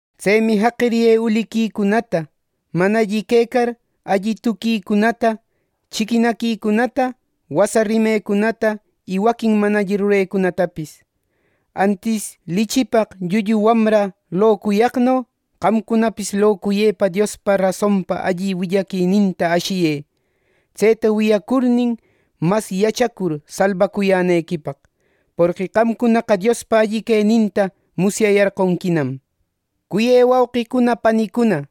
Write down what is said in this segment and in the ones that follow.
Tsemi jaqiriyë uliquicunata, mana alli quecar alli tuquicunata, chiquinaquicunata, wasa rimecunata y waquin mana alli rurecunatapis. Antis lichipaq llullu wamra locuyaqno, qamcunapis locuyepa Diospa rasonpa alli willaquininta ashiyë, tseta wiyacurnin, mas yachacur salbacuyänequipaq. Porqui qamcunaqa Diospa alli queninta musyayarqonquinam. Cuyë wauqicuna panicuna,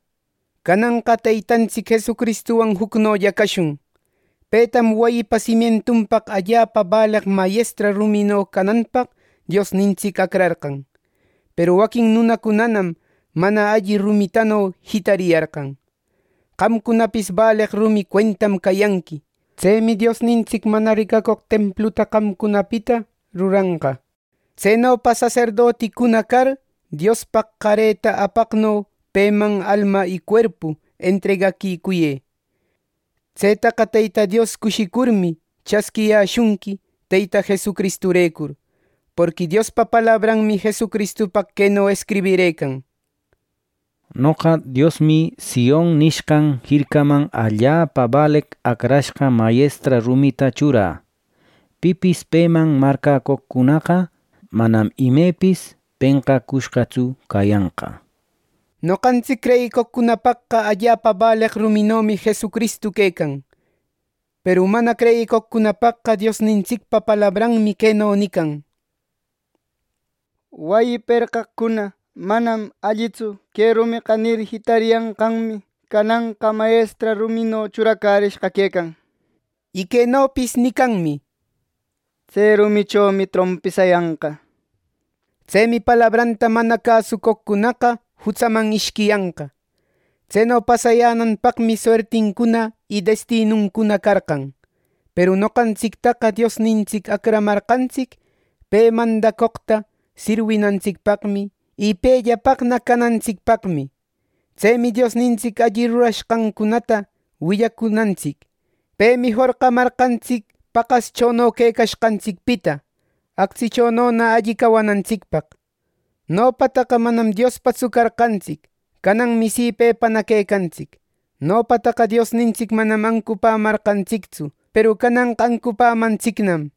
cananqa Teytantsic Jesucristuwan jucnolla cashun. Petam wayipa simientunpaq allapa baleq mayestra rumino cananpaq Diosnintsic acrarqan. Peru waquin nunacunanam mana alli rumitano jitariyarqan. Qamcunapis baleq rumi cuentam cayanqui. Tsemi Diosnintsic mana ricacoq templuta qamcunapita ruranqa. Tsenopa saserdotincuna car, Diospaq qareta apaqno peman alma y cuerpu entregaquicuyë. Tsetaqa Teyta Dios cushicurmi, chasquiyäshunqui Teyta Jesucristurecur. Porqui Diospa palabranmi Jesucristupaq queno escribirëcan: “Noqa Diosmi Sion nishqan jircaman allapa baleq acrashqa mayestra rumita churä. Pipis peman marcäcoqcunaqa manam imepis penqacushqatsu cayanqa” Noqantsic creyicoqcunapaqqa allapa baleq ruminomi Jesucristu quecan; peru mana creyicoqcunapaqqa Diosnintsicpa palabranmi queno nican: “Wayi perqaqcuna ‘Manam allitsu que rumeqa’ nir, jitariyanqanmi, cananqa mayestra rumino churacärishqa quecan” nir. Y quenopis nicanmi: “Tse rumichomi trompisayanqa” nishpa. Tsemi palabranta mana cäsucoqcunaqa jutsaman ishquiyanqa. Tseno pasayänanpaqmi suertincuna y destinuncuna carqan. Peru noqantsictaqa Diosnintsic acramarqantsic pe mandacoqta sirwinantsicpaqmi, y pellapaqna canantsicpaqmi. Tsemi Diosnintsic alli rurashqancunata willacunantsic. Pemi jorqamarqantsic paqaschono quecashqantsicpita, actsichonona alli cawanantsicpaq. Nopataqa manam Diospatsu carqantsic; cananmi si pepana quecantsic. Nopataqa Diosnintsic manam ancupämarqantsictsu; peru cananqa ancupämantsicnam.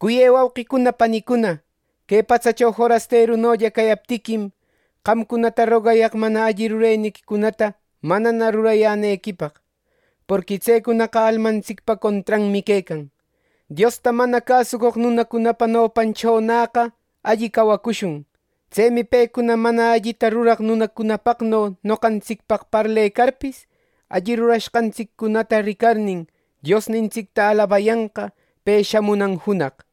Cuyë wauqicuna panicuna, que patsacho forasterunolla cayaptiquim, qamcunata rogayaq mana alli muneniquicunata manana rurayänequipaq. Porqui tsecunaqa almantsicpa contranmi quecan. Diosta mana cäsucoq nunacunapa nopanchonäqa alli cawacushun. Tsemi pecuna mana allita ruraq nunacunapaqno noqantsicpaq parlecarpis, alli rurashqantsiccunata ricarnin, Diosnintsicta alabayanqa pe shamunan junaq.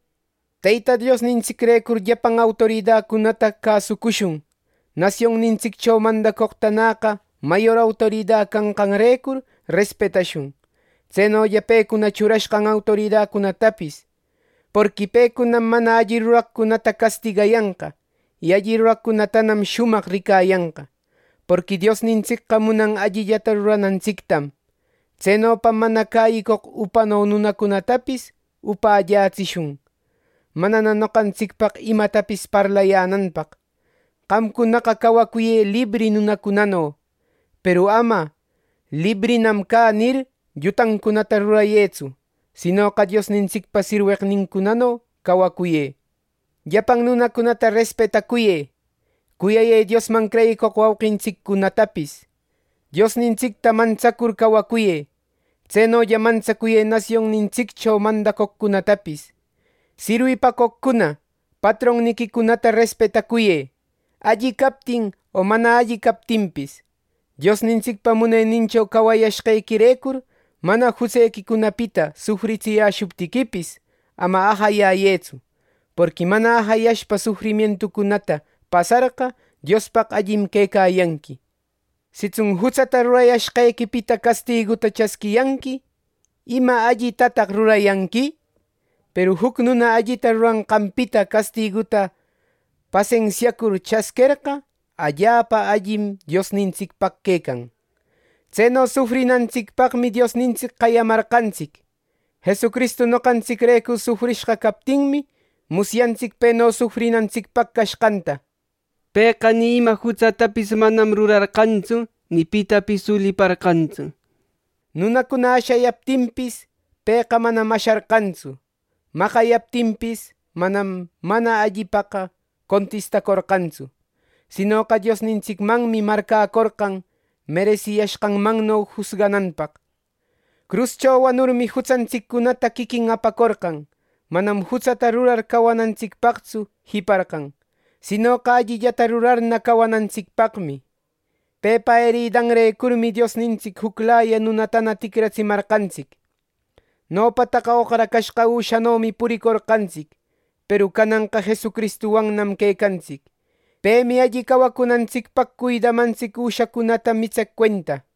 Teyta Diosnintsicrecur llapan autoridacunata cäsucushun; nasionnintsiccho mandacoqtanäqa mayor autorida canqanrecur, respetashun. Tsenolla pecuna churashqan autoridacunatapis. Porqui pecunam mana alli ruraqcunata castigayanqa, y alli ruraqcunatanam shumaq ricayanqa. Porqui Diosnintsicqa munan allillata ruranantsictam. Tsenopam mana cäyicoq upano nunacunatapis upällätsishun, manana noqantsicpaq imatapis parlayänanpaq. Qamcunaqa cawacuyë libri nunacunano. Peru ama “librinam cä” nir, llutancunata rurayëtsu. Sinoqa Diosnintsicpa sirweqnincunano cawacuyë. Llapan nunacunata respetacuyë. Cuyayë Diosman creyicoq wauqintsiccunatapis. Diosnintsicta mantsacur cawacuyë. Tsenolla mantsacuyë nasionnintsiccho mandacoqcunatapis. Sirwipacoqcuna, patronniquicunata respetacuyë, alli captin o mana alli captinpis. Diosnintsicpa munenincho cawayashqequirecur, mana jutsequicunapita sufritsiyäshuptiquipis, ama ajayayëtsu. Porqui mana ajayashpa sufrimientucunata pasarqa Diospaq allim quecayanqui. Sitsun jutsata rurayashqequipita castiguta chasquiyanqui, ¿ima allitataq rurayanqui? Peru juc nuna allita ruranqanpita castiguta pasensiacur chasquerqa, allapa allim Diosnintsicpaq quecan. Tseno sufrinantsicpaqmi Diosnintsic qayamarqantsic. Jesucristu noqantsicrecur sufrishqa captinmi, musyantsic peno sufrinantsicpaq cashqanta. Pëqa ni ima jutsatapis manam rurarqantsu, ni pitapis uliparqantsu. Nunacuna ashayaptinpis, pëqa manam asharqantsu. Maqayaptinpis, manam mana allipaqa contistacorqantsu. Sinoqa Diosnintsicmanmi marcäcorqan meresiyashqanmanno jusgananpaq. Cruscho wanurmi, jutsantsiccunata quiquin apacorqan. Manam jutsata rurar cawanantsicpaqtsu jiparqan, sinoqa allillata rurarna cawanantsicpaqmi. Pepa eridanrecurmi Diosnintsic juclaya nunatana ticratsimarqantsic. Nopataqa oqracashqa üshanomi puricorqantsic; peru cananqa Jesucristuwannam quecantsic. Pemi alli cawacunantsicpaq cuidamantsic üshacunata mitseq cuenta.